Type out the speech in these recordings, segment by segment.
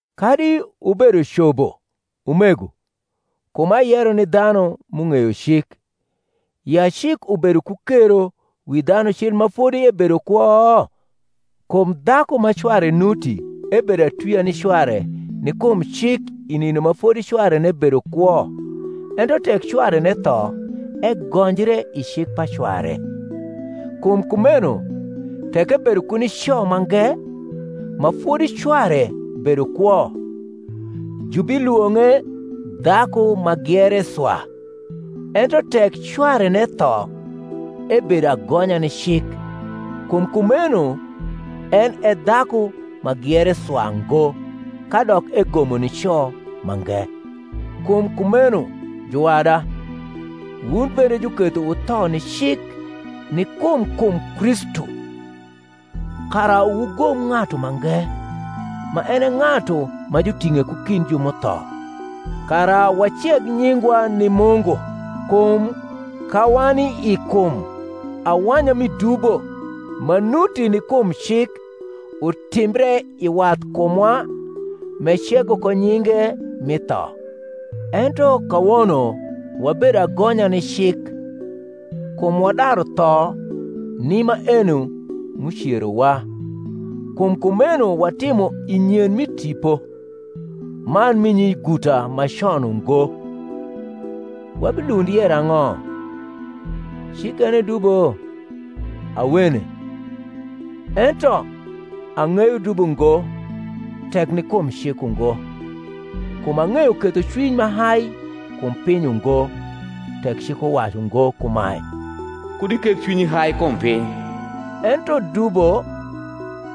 Kadi wubedo cobo, umego (kum ayero ni dhanu m’ung’eyo cik), ya cik ubedo ku kero wi dhanu cil ma fodi ebedo kwo? Kum dhaku ma cware nuti ebedo atwia ni cware ni kum cik i nindo ma fodi cwarene bedo kwo; ento tek cwarene tho, egonjre i cik pa cware. Kum kumeno, tek ebedo ku nico mange, ma fodi cware bedo kwo, jubilwong’e dhaku ma giere swa: ento tek cwarene tho, ebedo agonya ni cik, kum kumeno en e dhaku ma giere swa ngo, kadok egomo nico mange. Kum kumeno, juwada, wun bende juketho wutho ni cik ni kum kum Kristu; kara wugom ng’atu mange, ma en e ng’atu ma juting’e ku kind ju m’utho, kara waceg nyingwa ni Mungu. Kum ka wani i kum, awanya mi dubo, ma nuti ni kum cik, utimbre i wathkumwa m’ecego ko nyinge mi tho. Ento kawono wabedo agonya ni cik, kum wadaru tho ni maeno m’ucerowa; kum kumeno watimo i nyen mi tipo, man mi nyiguta ma con ungo. Wabilund yero ang’o? cik en e dubo? Awene. Ento, ang’eyo dubo ngo, tek ni kum cik ungo: kum ang’eyo kethocwiny ma hai kum piny ungo, tek cik uwacu ngo kumae, Kud iketh cwinyi hai kum piny: ento dubo,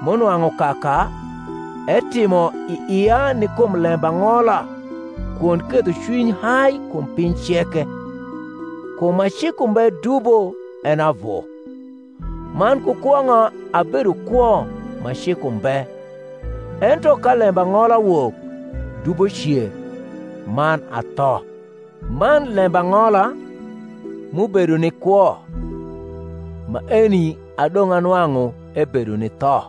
m’unwang’u kaka, etimo i ia ni kum lembang’ola kwond kethocwiny hai kum piny ceke, kum ma cik umbe dubo en e avu. Man ku kwong’a abedo kwo ma cik umbe: ento ka lembang’ola wok, dubo cer, man atho; man lembang’ola, m’ubedo ni kwo, maeni adong’ anwang’u ebedo ni tho: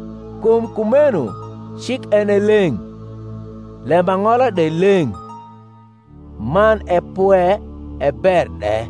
Kum kumeno cik en e leng’, lembang’ola de leng’, man e pwe, e ber de.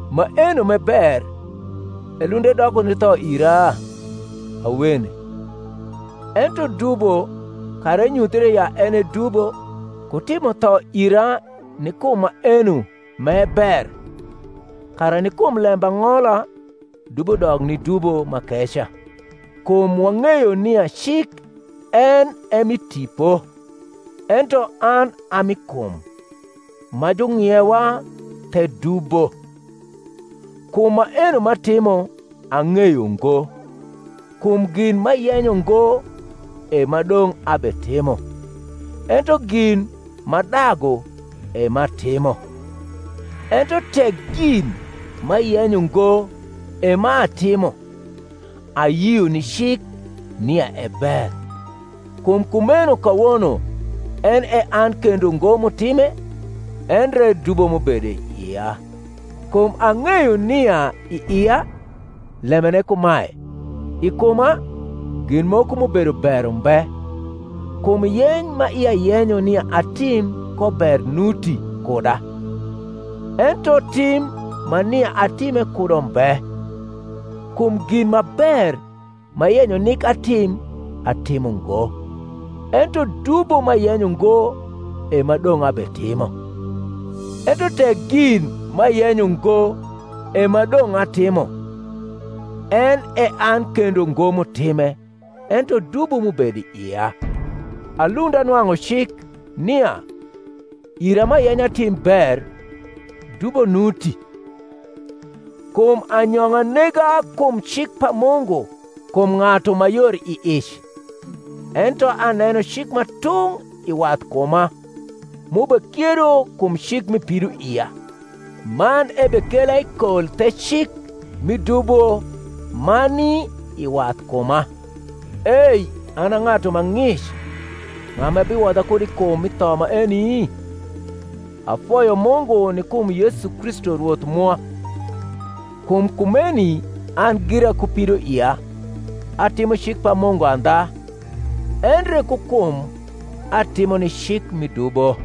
Maenom’e ber elund edoko ni tho ira? Awene. Ento dubo, kara enyuthre ya en e dubo, ku timo tho ira ni kum maeno m’e ber; kara ni kum lembang’ola dubo dok ni dubo m’akeca. Kum wang’eyo nia cik en e mi tipo: ento an a mi kum, ma jung’iewa the dubo. Kum maeno m’atimo ang’eyo ngo: kum gin m’ayenyo ngo, e m’adong’ abetimo; ento gin m’adagu, e m’atimo. Ento tek gin m’ayenyo ngo, e m’atimo, ayio ni cik nia e ber. Kum kumeno kawono en e an kendo ngo m’utime, endre dubo m’ubedo i ia. Kum ang’eyo nia i ia, lembene kumae, i kuma, gin moko m’ubedo ber umbe: kum yeny ma ia yenyo nia atim ko ber nuti kuda, ento tim ma nia atime kudo mbe. Kum gin ma ber m’ayenyo nik atim atimo ngo: ento dubo m’ayenyo ngo, e m’adong’ abetimo. Ento tek gin m’ayenyo ngo, e m’adong’ atimo, en e an kendo ngo m’utime, ento dubo m’ubedo i ia. Alund anwang’u cik, nia, ira m’ayenyo atim ber, dubo nuti. Kum anyong’a nega kum cik pa Mungu kum ng’atu ma yor i ic: ento aneno cik ma tung’ i wathkuma, m’ubekiedo kum cik mi pidoia, man ebekela i kol the cik mi dubo ma ni i wathkuma. Ei an a ng’atu ma ng’ic ng’a ma biwodha kud i kum mi tho maeni? Afoyo Mungu ni kum Yesu Kristu Rwoth mwa. Kum kumeni an gira ku pidoia, atimo cik pa Mungu andha; endre ku kum atimo ni cik mi dubo.